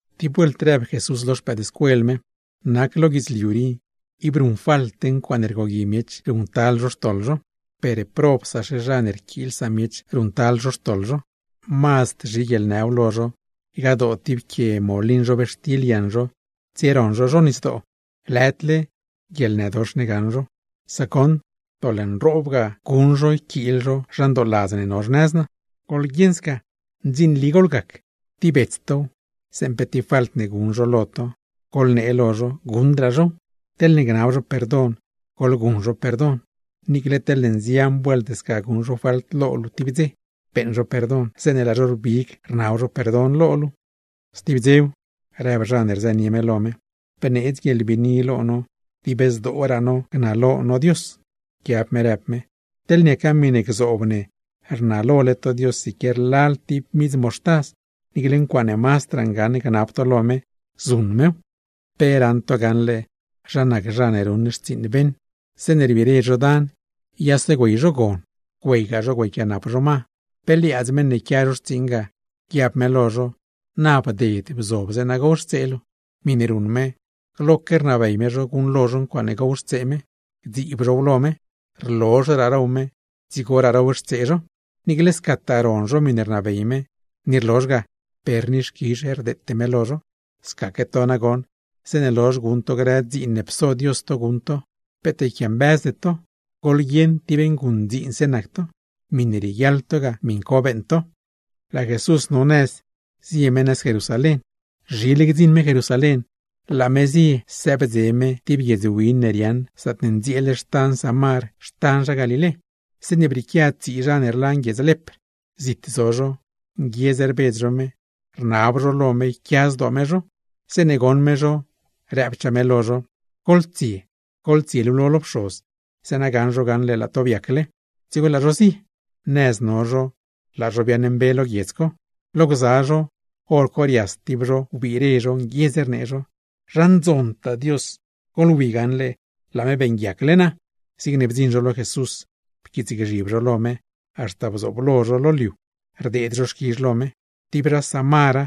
Tib vuelt rëb Jesús lo xpëëdscuel me: ―Nac lo guidzliu rii, ib guṉfalte ncuaaṉe rgogui miech guṉctal zho xtoḻ zho, ¡per probsaxe zha ne rquiil samiech ruṉctal zho xtoḻ zho! Mazd zhi guieḻnëw lo zho ygadoo tib quie molin zhobxtil yaṉ zho tsieroṉ zho zho nisdoo, lëdle guieḻnëdox ne gaṉ zho; sac goṉ doḻ nroob ga guṉ zho yquiil zho zha ndooladz ne no xnëz naa. ¡Goḻguieṉ sca ndzinli goḻgac! Tib bets tow, zeeṉe pe tib falt guṉ zho lo to, goḻnee lo zho guṉdraa zhow; teḻne gnab zho perdon, goḻguṉ zho perdon. Niicle teḻne nzian vuelt sca guṉ zho falt lo luu tib dze, beeṉ zho perdon zeeṉe laa zho rbig rnab zho perdon lo luu. Stib dzew, rëb zha ne rzënie me lo me: ―Bneedz guieḻbiini lo no dib zdooraa no gnalo no Dios. Pquiab me rëb me: ―Teḻ niaca miṉe gzoob ne rnalole to Dios siquier lal tib midz moxtaz, niicle ncuaaṉe mazdraa ngaṉ gnab to lo me, zuṉ mew. ’¿Pe raṉ to gaṉle, zha nac zha ne ruṉ xtsiiṉ beṉ? Zeeṉe rbire zho dan, yase güey zho gon, güeygaa zho güeyquianap zho ma, pe liaadz meṉ ne quia zho xtsiiṉ ga, guiab me lo zho: “Na bded, bzob, zeeṉa gowxtsee luu.” Miṉe ruṉ me, gloque rnabey me zho guṉlo zho ncuaaṉe gowxtsee me, gdziib zhow lo me; rlozhraa row me, dzigoraa rowxtsee zho. Niicle scataa ron zho miṉe rnabey me, ni rlozh ga, per ni xquizh rdeete me lo zho. Scaque to nagoṉ, zeeṉe lozh guṉ to grë dziin ne pso Dios to guṉ to, peet yquiambëzde to, goḻguieṉ tib nguṉdziinse nac to, miṉe rieguiaḻ to ga, miṉ co beeṉ to. Laa Jesús no nëz zie me nëz Jerusalén. Laa me zieded tib guiedz win ne riaaṉ zaatne ndzieel xtan Samar xtan zha Galilé, zeeṉe brieequia tsii zha ne rlan guiedz lepr. Zit zo zho, nguiedz rbedz zho me, rnab zho lo me yquia zdoo me zho. Zeeṉe goṉ me zho, rëbchaa me lo zho: ―¡Goḻtsie, goḻtsielulo lo pxoz, zeeṉa gaṉ zho gaṉle laa to biacle! Dzigo laa zho zie. Nëz no zho laa zho biaaṉmbe lo guiedz co. Lo gza zho, hor co rias tib zho wbire, nguiedz rnee zho: ―¡Zha ndzontaa Dios! ¡Goḻwi gaṉle laa me beeṉguiacle naa! Zigne bdziṉ zho lo Jesús, pquiitsgzhib zho lo me, haxta bdziṉ lo zho lo liu, rdeed zho xquizh lo me. Tib zha Samara,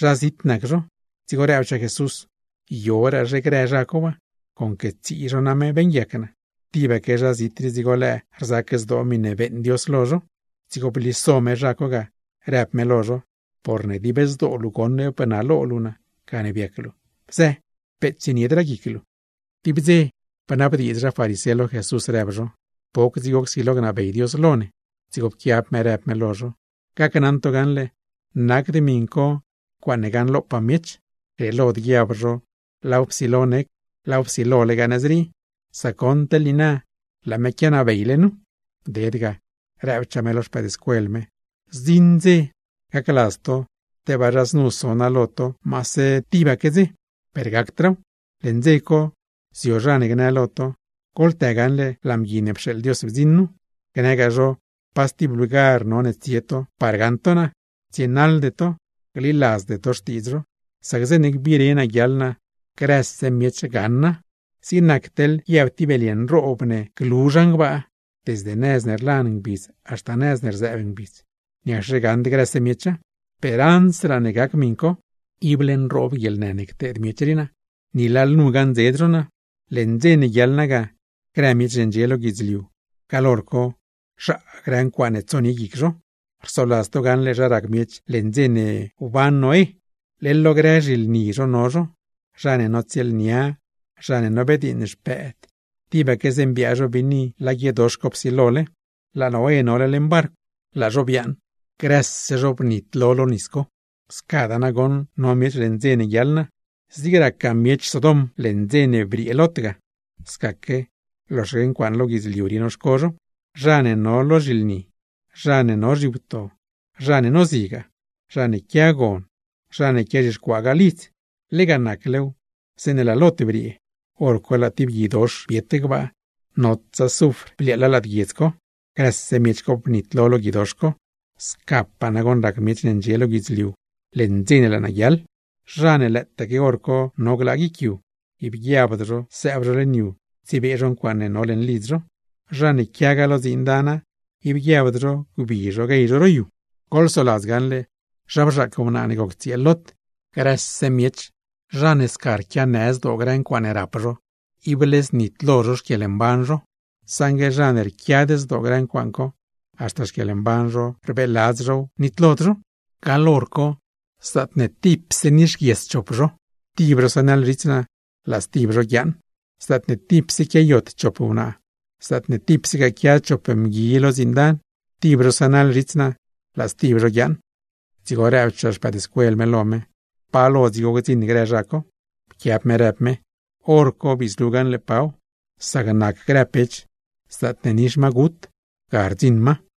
zha zit nac zho. Dzigo rëbchaa Jesús: ―¿Yoraazhe grë zha co waa? Conque tsii zho name beeṉguiac naa. ¿Tibaque zha zit rii dzigo lëë rzac zdoo miṉe beeṉ Dios lo zho? Dzigo bliso me zha co ga, rëb me lo zho: ―Porne dib zdoo luu goṉ bnalo luu Dios, gane biac luu. Bzë, peet tsieniedraa guic luu. Tib dze bnabdiidz zha farisé lo Jesús, rëb zho: ―¿Poc dzigo csilo gnabey Dios lo ne? Dzigo pquiab me rëb me lo zho: ―Gacnaṉ to gaṉle, nacd miṉ co ncuaaṉe gaṉlopaa miech. Grieelod guiab zho laaw psilo nec, laaw psilolegaa nëz rii; sac goṉ teḻ niina laa me quianabeyle nu. Bded ga, rëbchaa me lo xpëëdscuel me: ―Zdziṉ dze, gacladz to tebaa zha znu so naa lo to maase tibaque dze, per gacdraaw. Leṉ dze co, zio zha ne gnë lo to: “Goḻtë gaṉle laa Mgui ne pxeeḻ Dios bdziṉ nu”; gnëgaa zho pa stib lugar none tsie to par gaṉ to naa; tsienaḻde to, gliladzde to xtiidz zho. Sac zeeṉe gbiire guiaḻ naa, grëse miech gaṉa. Zig nac teḻ guiab tib belye nroob ne glu zhan gbaa desde nëz ne rlan ngbidz haxta nëz ne rzëëb ngbidz, ¿niacxe gaṉd grëse miecha? Per ansraa ne gac miṉ co, ible nroob guieḻnë ne cteed miech rii naa, ni lalnu gaṉdzed zho naa. Leṉ dze ne guiaḻ naa ga, grë miech ne ndxie lo guidzliu gaḻ hor co, zhaa grë ncuaaṉe tsonie guic zho. Rsoladz to gaṉle zha rac miech leṉ dze ne biaad Noé, leḻ lo grë zhilni zho no zho, zha ne notsieelnia, zha ne nobediiṉ xpëëd, tibaque zeeṉe biaa zho biini laa guiedox co psilole. Laa Noé nole leṉ barcw, laa zho biaaṉ grëse zho bnitlo lo nis co. Scadaa nagoṉ no miech leṉ dze ne guiaḻ naa. Zig racgaa miech Sodom leṉ dze ne briee Lot ga. Scaque, loxaque ncuaaṉ lo guidzliu rii noxco zho, zha ne no lo zhilni, zha ne no zhiwto, zha ne nozigaa, zha ne quia gon, zha ne quiazhixcuaagaa lidz. Lega naclew, zeeṉe laa Lot briee, hor co laa tib guidox biet gbaa, notsa zufr bliaaḻa lad guiedz co, grëse miech co bnitlo lo guidox co. Scapaa nagoṉ rac miech ne ndxie lo guidzliu leṉ dze ne laa naa guiaḻ. ’Zha ne lëëtaque hor co no glaa guic yu, ib guiabd zho sëëb zho leṉ yu tsiebee zho ncuaaṉe no leṉ lidz zho, zha ne quiagaa lo dziin dana, ib guiabd zho gbi zho guey zho ro yu. ¡Goḻsoladz gaṉle zha bzhaac wnaa ne goc tsieel Lot! Grëse miech, zha ne sca rquianë zdoo grë ncuaaṉe rap zho, ible znitlo zho xquieḻmban zho; saṉgue zha ne rquiad zdoo grë ncuaaṉ co, haxta xquieḻmban zho rbeeladz zhow, nitlod zho. Gaḻ hor co, zaatne tipse nixguies chop zho, tib zho sënaḻ zhits naa, laa stib zho guiaaṉ. Zaatne tipse quiayot chop wnaa, zaatne tipsegaa quia chop mgui lo dziin dana, tib zho sënaḻ zhits naa, laa stib zho guiaaṉ. Dzigo rëbchaa xpëëdscuel me lo me: ―¿Pa lo dzigo gdziṉ grë zha co? Pquiab me rëb me: ―Horco bii zlu gaṉle paw. Zig nac grë pech, zaatne nix magut ga rdziṉ ma.